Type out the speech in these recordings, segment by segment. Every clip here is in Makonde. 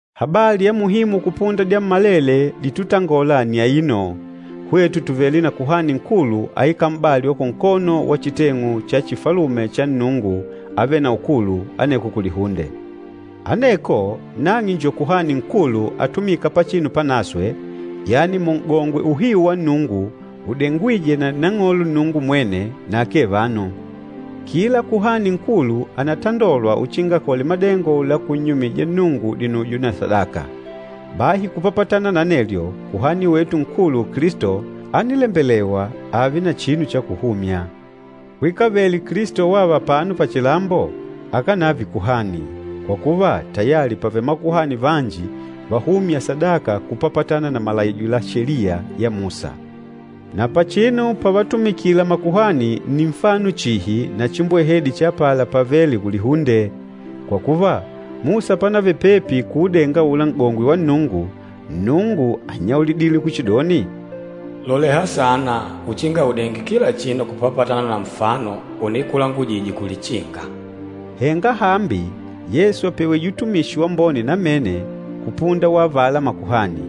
Habali ya muhimu kupunda dyammalele ditutangolela nni aino, hwetu tùvele na Kuhani Nkulu aikâla m'bali wa kunkono wa chiteng'u cha chifalume cha Nnungu Avêle na Ukulu, aneko kulihunde. Aneko nang'e njo Kuhani Nkulu atumîka Pachinu Panaswe, yani Mun'gongwe uhiu wa Nnungu udengwîjwe na Nang'olo Nnungu mwene, na akee vanu. Kila Kuhani Nkulu ànatandolwa uchinga akole madengo la kunnyumija Nnungu dinujo na sadaka. Bahi kupapatana na anelyo, Kuhani wetu Nkulu Kilisto ánilembelewa ààve na chinu cha kuhumya. Kwikavele Kilisto wava apano pachilambo, akánave kuhani, kwa kuva tayali pàvele makuhani vanji vahûmya sadaka kupapatana na malaijo la Sheliya ya Musa. Na pachinu pavatumikila makuhani nni nfano chihi na chimbwehedi cha apala pavêle kulihunde. Kwa kuva, Musa panavele pepi kuudenga aula N'gongwe wa Nnungu, Nnungu ánnyaulidile kuchidoni, “Loleha saana uchinga udenge kila chinu kupapatana na nfano unikulangujije kulichinga.” Henga hambi Yesu àpewije utumishi wambone namene kupunda wa avala makuhani.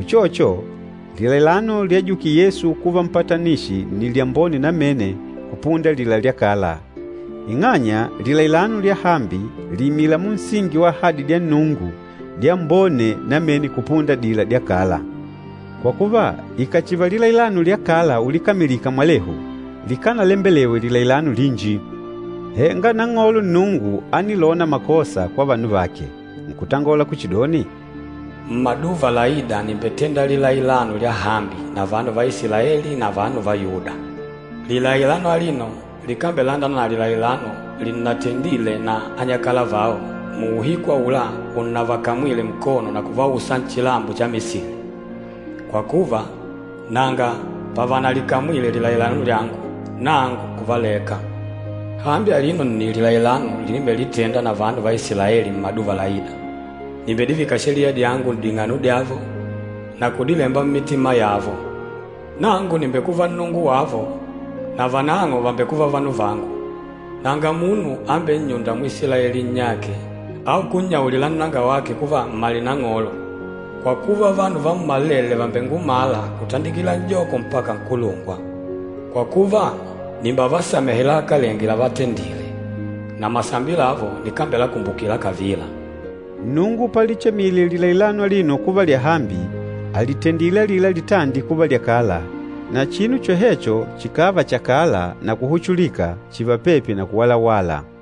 Uchocho, lilailano lyajukile Yesu kuva mpatanishi nni lyambone namene kupunda alila lya kala, ing'anya lilailano lyahambi lìimila munsingi wa ahadi dya Nnungu dyambone namene kupunda adila dya kala. Kwa kuva, ikàchiva lilailano lya kala ulikamilika mwalehu, likánalembelewe lilailano linji. Henga Nang'olo Nnungu ánilona makosa kwa vanu vake, nkutangola kuchidoni, “Mmaduva laîda nìmbetenda lilailano lyahambi na vanu va Isilaeli na vanu va Yuda. Lilailano alino likambelandana na lilailano linnatendile na anyakala vao, muuhiku aula unnavakamwile nkono na kuvausa nchilambo cha Misili. Kwa kuva, nanga pavanalikamwile lilailano lyangu, nangu nkuvaleka. Hambi alino nni lilailano linimbelitenda na vanu va Isilaeli mmaduva laîda, nìmbedivika Sheliya dyangu n'ding'ano dyavo na kudilemba mmitima yavo. Nangu nìmbekuva Nnungu wavo, na vanang'o vàmbekuva vanu vangu. Nanga munu ambennyûnda Mwisilaeli nnyake, au kunnyaulila nnangawake kuva, ‘Mmale Nang'olo.’ Kwa kuva, vanu vammalele vàmbengumala, kutandikila n'joko mpaka nkulungwa. Kwa kuva, nìmbevasamehe lahakalenge lavatendile, na masambi lavo nikambelakumbukila kavila.” Nnungu palichemile lilailano alino kuva lyahambi, àlitendile alila litandi kuva lyakala, na chinu chohecho chikààva chakala na kuhuchulika chììva pepi na kuwalawala.